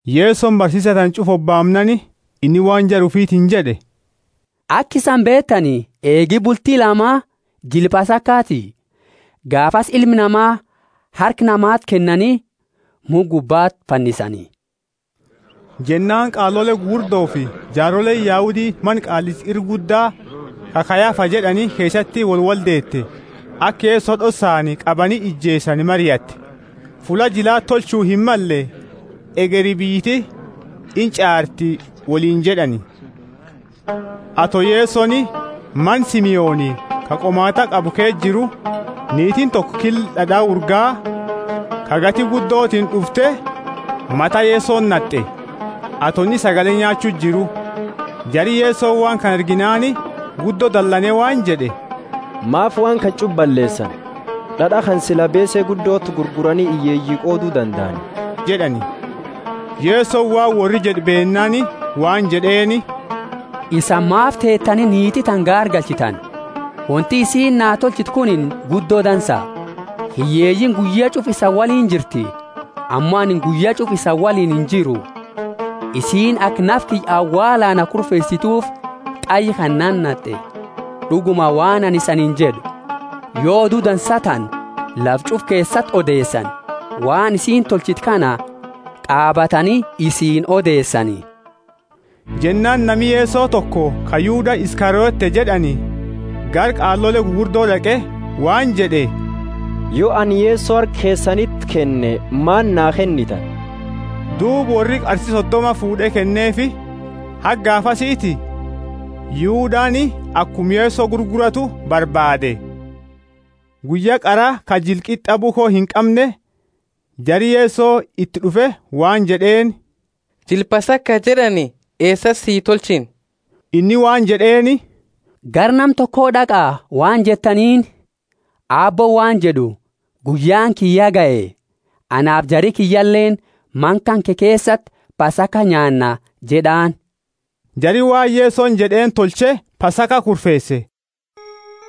Yesoni barsiisa tana ch'ufa hobaamnaani, inni waan jara ufitiini jed'e, Aka isani beetani, eegi bulti lamaa jila Pasakaati; gaafasi Ilma Nama harka namati kennani mukha gubbati fannisani. Jennaani qaalole gugurdofi jaaroleeni Yahudi mana Qaallicha ira Gudda, ka Kayafa jed'ani keesati wolwoldeete, aka Yeso d'ossaani qabani ijeesani mariatte. Fulla jilati tolchu himmalle, hegeri biyyiti inch'aarti wolinjed'ani. Ato Yesoni mana Simoni ka qomaat'a qabu keesa jiru, niitiini toko killa d'ad'a urgaa, ka gati guddotiini d'ufte, mata Yesoti nat'e, ato inni sagale nyaachu jiru. Jari Yeso waan kana arginaani guddo dalane waan jed'e, Maafi waan kana ch'ufa balleesani? D'ad'a kana sila beese guddoti gurgurani hiyyeeyi qoodu dandaani jed'ani. Yesoni waan worri jed'e beennaani waan jed'eeni, Isani maafi teetani niiti tana gaargalchitani? Wonti isiini naa tolchite kunini guddo dansa. Hiyyeeyiini guyya ch'ufa isani woliini jirti, ammo anini guyya ch'ufa isani woliini injiru. Isiini aka nafa kiyya awaalaa na kurfeesitufi qayya na nat'e. D'uguma, waan anini isaniini jed'u, Yo odu dansa tana lafa ch'ufa keesati odeesani, waan isiini tolchite kana qaabatani isiini odeesani. Jennaani nami Yeso toko ka Yuda Iskariote jed'ani gara qaalole gugurdo d'aqe waan jed'e, Yo anini Yeso harka keesaniti kenne, maani naa kennitani? Duuba worri qarsi sodoma fuud'e kenneefi. Haga gaafasiti Yudani akuma Yeso gurguratu barbaade. Guyya qara ka jila Qit'a bukho inqamne, jari Yeso iti d'ufe waan jed'eeni, Jila Pasaka jed'ani eesati si tolchina? Inni waan jed'eeni, Gara nama toko d'aqa waan jettaniini, Aabbooni waan jed'u, Guyyaani kiyya ya gahe; anaafi jari kiyyaleeni mana kanke keesati Pasaka nyaanna jed'aani. Jari waan Yesoni jed'eeni tolche Pasaka kurfeese.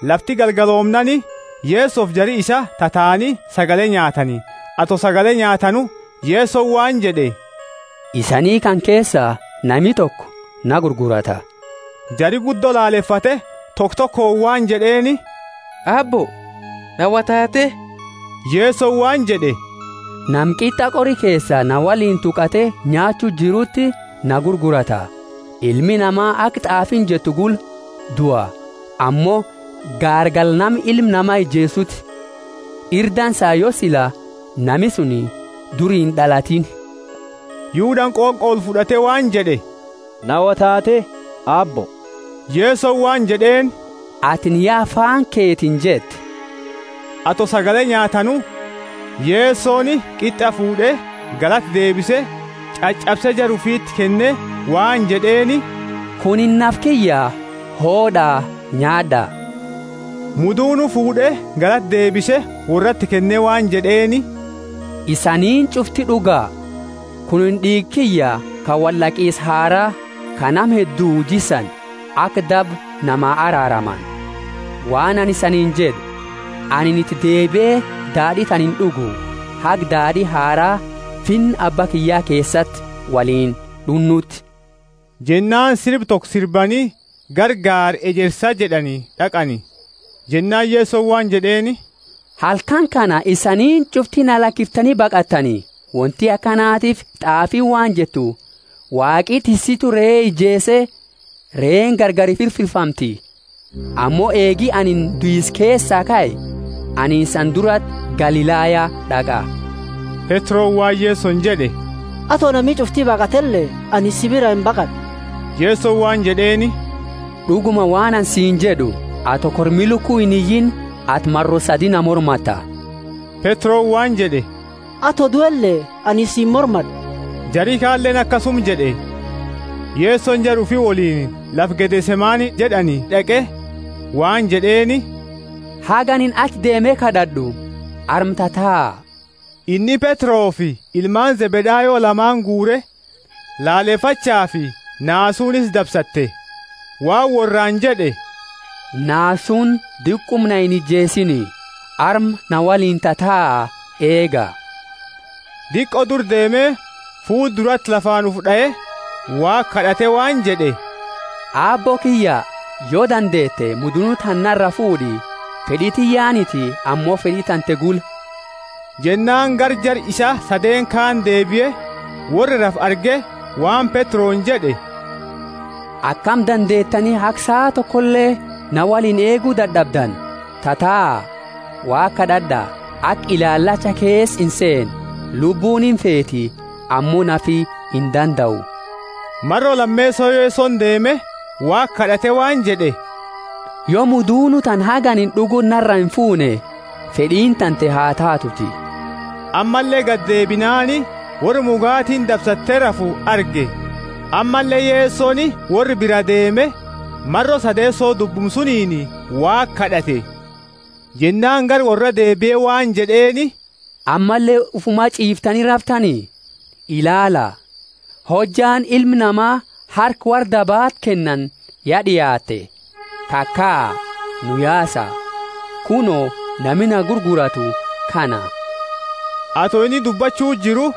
Lafti galgaloomnaani, Yesofi jari isaa tataani sagale nyaatani. Ato sagale nyaatanu, Yesoni waan jed'e, Isani kana keesa nami toko na gurgurata. Jari guddo lalefate, toko tokooni waan jed'eeni, Aabbo, naa wo taate? Yesoni waan jed'e, Nama qit'a qori keesa naa woliini tuqate nyaachu jiruti na gurgurata. Ilmi Nama aka t'aafiini jette gula dua; ammo gaargala nama Ilma Nama ijeesuti; ira dansa yo sila nami suni duri ind'alatiini. Yudani qonqo olfud'ate waan jed'e, Na wo taate, Aabbo? Yesoni waan jed'eeni, Atini ya afaani keetiini jette. Ato sagale nyaatanu, Yesoni qit'a fuud'e, galata deebise, ch'ach'abse, jara ufiti kenne waan jed'eeni, Kunini nafa kiyya, hood'a, nyaad'a. Mudunu fuud'e, galata deebise, worrati kenne waan jed'eeni, Isaniini ch'ufti d'uga. Kunini d'iiga kiyya ka wold'aqisa haraa, ka nama hedduu jissani, aka daba nama araaramani. Waan anini isaniini jed'u, Anini iti deebie daad'i tana ind'ugu, haga daad'i haraa Finna Abba kiyya keesati woliini d'unnuuti. Jennaani sirba toko sirbani gara Gaara Ejersa jed'ani d'aqani. Jennaani Yesoni waan jed'eeni, Halkani kana isaniini ch'ufti na lakiftani baqattani, wonti akanatiifi t'aafiini waan jettu, Waaqi tissitu ree ijeese, reeni gargari firfirfamti. Ammo eegi anini duisa keesaa kae, anini isani durati Galilaya d'aqa. Petroni waan Yesoni jed'e, Ato nami ch'ufti baqatele, anini si biraa imbaqad'u. Yesoni waan jed'eeni, D'uguma waan anini siini jed'u, ato kormi luku iniyiini, ati maro sadi na mormatta. Petroni waan jed'e, Ato duele, anini si imormad'u. Jari kaleeni akasuma jed'e. Yesoni jara ufi woliini lafa Gethsemane jed'ani d'aqe waan jed'eeni, Haga anini achi deeme kad'ad'u, arma tataa. Inni Petrofi ilmaani Zebedayo lamaani guure. Lalefachafi naasuuni isa dabsatte, waan worraani jed'e, Naasuuni diquma na inijeesiini. Arma na woliini tataa eega. Diqo dura deeme fuula durati lafaani ufi d'ae, Waaqa kad'ate waan jed'e, Aabbo kiyya yo dandeete mudunu tana nara fuud'i, fed'i tiyyaaniti ammo fed'i tante gula. Jennaani gara jara isaa sadeeni kaani deebie, worra rafu arge waan Petroni jed'e, Akami dandeetani haga saa tokole na woliini eegu dad'abdani? Tataa, Waaqa kad'ad'a, aka ilaalacha keesa inseene. Lubbuuni imfeeti, ammo nafi indandau. Maro lameeso Yesoni deeme, Waaqa kad'ate waan jed'e, Yo mudunu tana haga anini d'uguti naraa imfuune, fed'iini tante ha taatuuti. Ammalle gadeebinaani worra muugatiini dabsatte rafu arge. Ammalle Yesoni worra biraa deeme, maro sadeeso dubbuma suniini Waaqa kad'ate. Jennaani gara worra deebie waan jed'eeni, Ammalle ufuma ch'iiftani raftani? Ilaala, hojjaani Ilma Nama harka worra dabaati kennani ya d'iaatte. Kakaa, nu yaasa. Kuno, nami na gurguratu kana. Ato inni dubbachu jiru,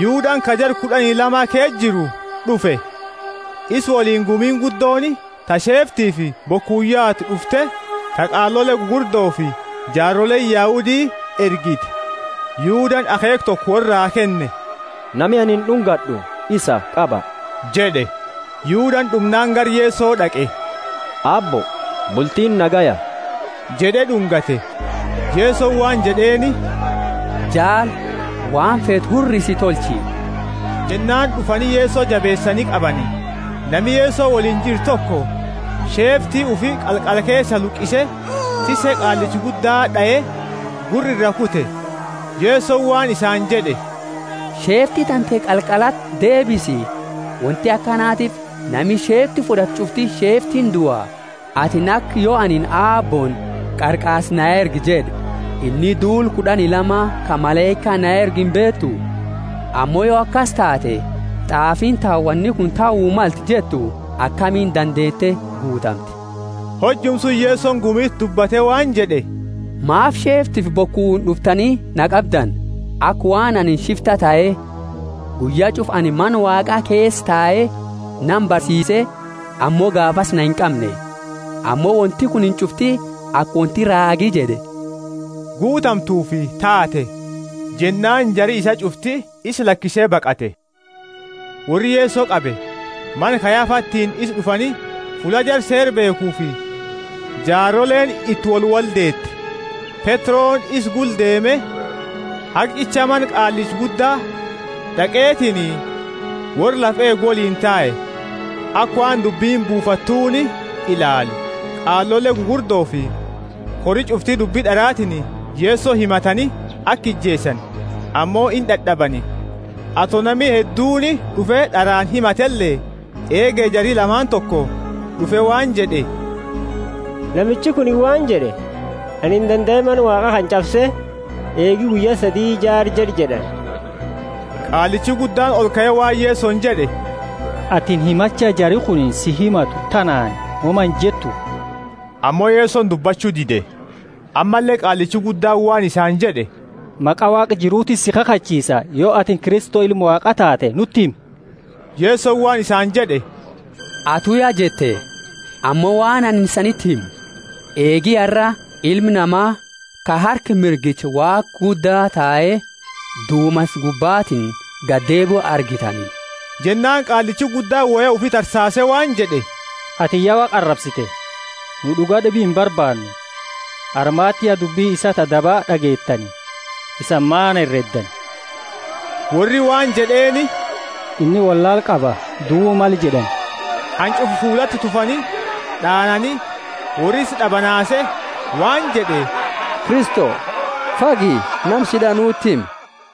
Yudani ka jara kud'ani lama ke jiru d'ufe. Isa woliini gumiini guddooni ta sheeftifi bokuuni yaatu d'ufte, ta qaalole gugurdofi jaaroleeni Yahudi ergite. Yudani akheekha toko worraa kenne, Nami anini d'ungad'u isa, qaba jed'e. Yudani d'umnaani gara Yeso d'aqe, Aabbo, bultiini nagaya? Jed'e d'ungate. Yesoni waan jed'eeni, Jaali, waan feetu hurrisi tolchi. Jennaani d'ufani Yeso jabeesani qabani. Nami Yeso woliini jiru toko, sheefti ufi qalqala keesaa luqise, tisse qaallicha gudda d'ae, gurra iraa kute. Yesoni waan isaani jed'e, Sheefti tante qalqalati deebisi; wonti akanatiifi nami sheefti fud'atu ch'ufti sheeftiini dua. Atini aka yo anini Aabbooni, Qarqaarsa na ergi jed'e, inni duula kud'ani lama ka malaika na ergu imbeetu? Ammo yo akasi taate, t'aafiini ta woni kuni tahu malte jettu akami dandeete guutamti? Hojuma suni Yesoni gumiti dubbate waan jed'e, Maafi sheeftifi bokuuni d'uftani na qabdani, aka waan anini shifta tahe. Guyya ch'ufa anini Mana Waaqa keesa tae nama barsiise, ammo gaafasi na inqamne. Ammo wonti kunini ch'ufti aka wonti raagi jed'e, guutamtufi taate. Jennaani jari isaa ch'ufti isa lakise baqate. Worri Yeso qabe, mana Kayafatiini isa d'ufani, fulla jara Seera beekhufi jaaroleeni iti wolwoldeete. Petroni isa gula deeme haga ch'icha mana qaallicha gudda, d'aqetiini worra lafa eegu woliini tae, aka waan dubbini buufattuuni ilaalu. Qaalole gugurdofi kori ch'ufti dubbi d'aratiini Yeso himatani, aka ijeesani; ammo indad'abani, ato nami hedduuni d'ufe, d'araani himatele. Eege jari lamaani toko d'ufe waan jed'e, Namichi kunini waan jed'e, Anini dandae Mana Waaqa ch'abse, eegi guyya sadi jaara jed'e jed'ani. Qaallichi guddaani olkae waan Yesoni jed'e, Atini himacha jari kunini si himatu tanaani woma injettu? Ammo Yesoni dubbachu dide. Ammalle qaallichi guddaani waan isaani jed'e, Maqa Waaqa jirutiini si kakhachiisa, Yo atini Kristo, Ilma Waaqa taate, nuti himi. Yesoni waan isaani jed'e, Atu ya jette. Ammo waan anini isaniti himu, Eegi arra, Ilma Nama ka harka mirgicha Waaqa Gudda tae, dumansa gubbatiini gadi deebiu argitani. Jennaani qaallichi guddaani woya ufi tarsaase waan jed'e, Atini ya Waaqa arabsite, nu d'uga d'ibi imbarbaannu; armati ya dubbi isaa ta daba d'ageettani; isani maani hereddani? Worri waan jed'eeni, Inni wollaala qaba, duu male jed'ani. Hanch'ufa fuulati tufani d'aanani; worri isa d'abanaase waan jed'e Kristo, fagi nama si d'ae nuti himi.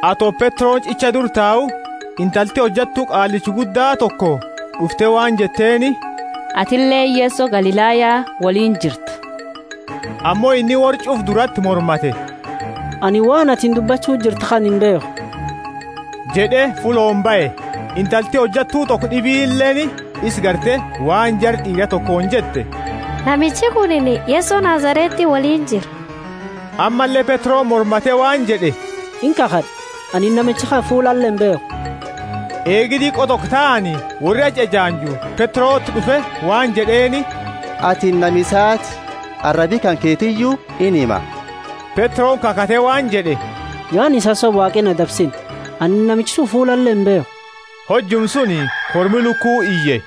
Ato Petroni ch'icha dura tau, intalti hojattu qaallicha gudda toko d'ufte waan jetteeni, Atileeni Yeso Galilaya woliini jirta. Ammo inni worra ch'ufa durati mormate, Anini waan atini dubbachu jirtu kana imbeekhu jed'e, fullooni bahe. Intalti hojattu toko d'ibileeni isa garte waan jara d'iira tokooni jette, Namichi kunini Yeso Nazareti woliini jira. Ammalle Petroni mormate waan jed'e, Inkakhad'a, anini namicha kana fuulale imbeekhu. Eegi diqo toko taani, worri achi ejaanju Petroti d'ufe waan jed'eeni, Atini nama isaati, arabi kanketiyu inhima. Petroni kakhate waan jed'e, Yo anini isani sobe Waaqi na dabsinna. Anini namicha suni fuulale imbeekhu. Hojuma suni kormi luku iye.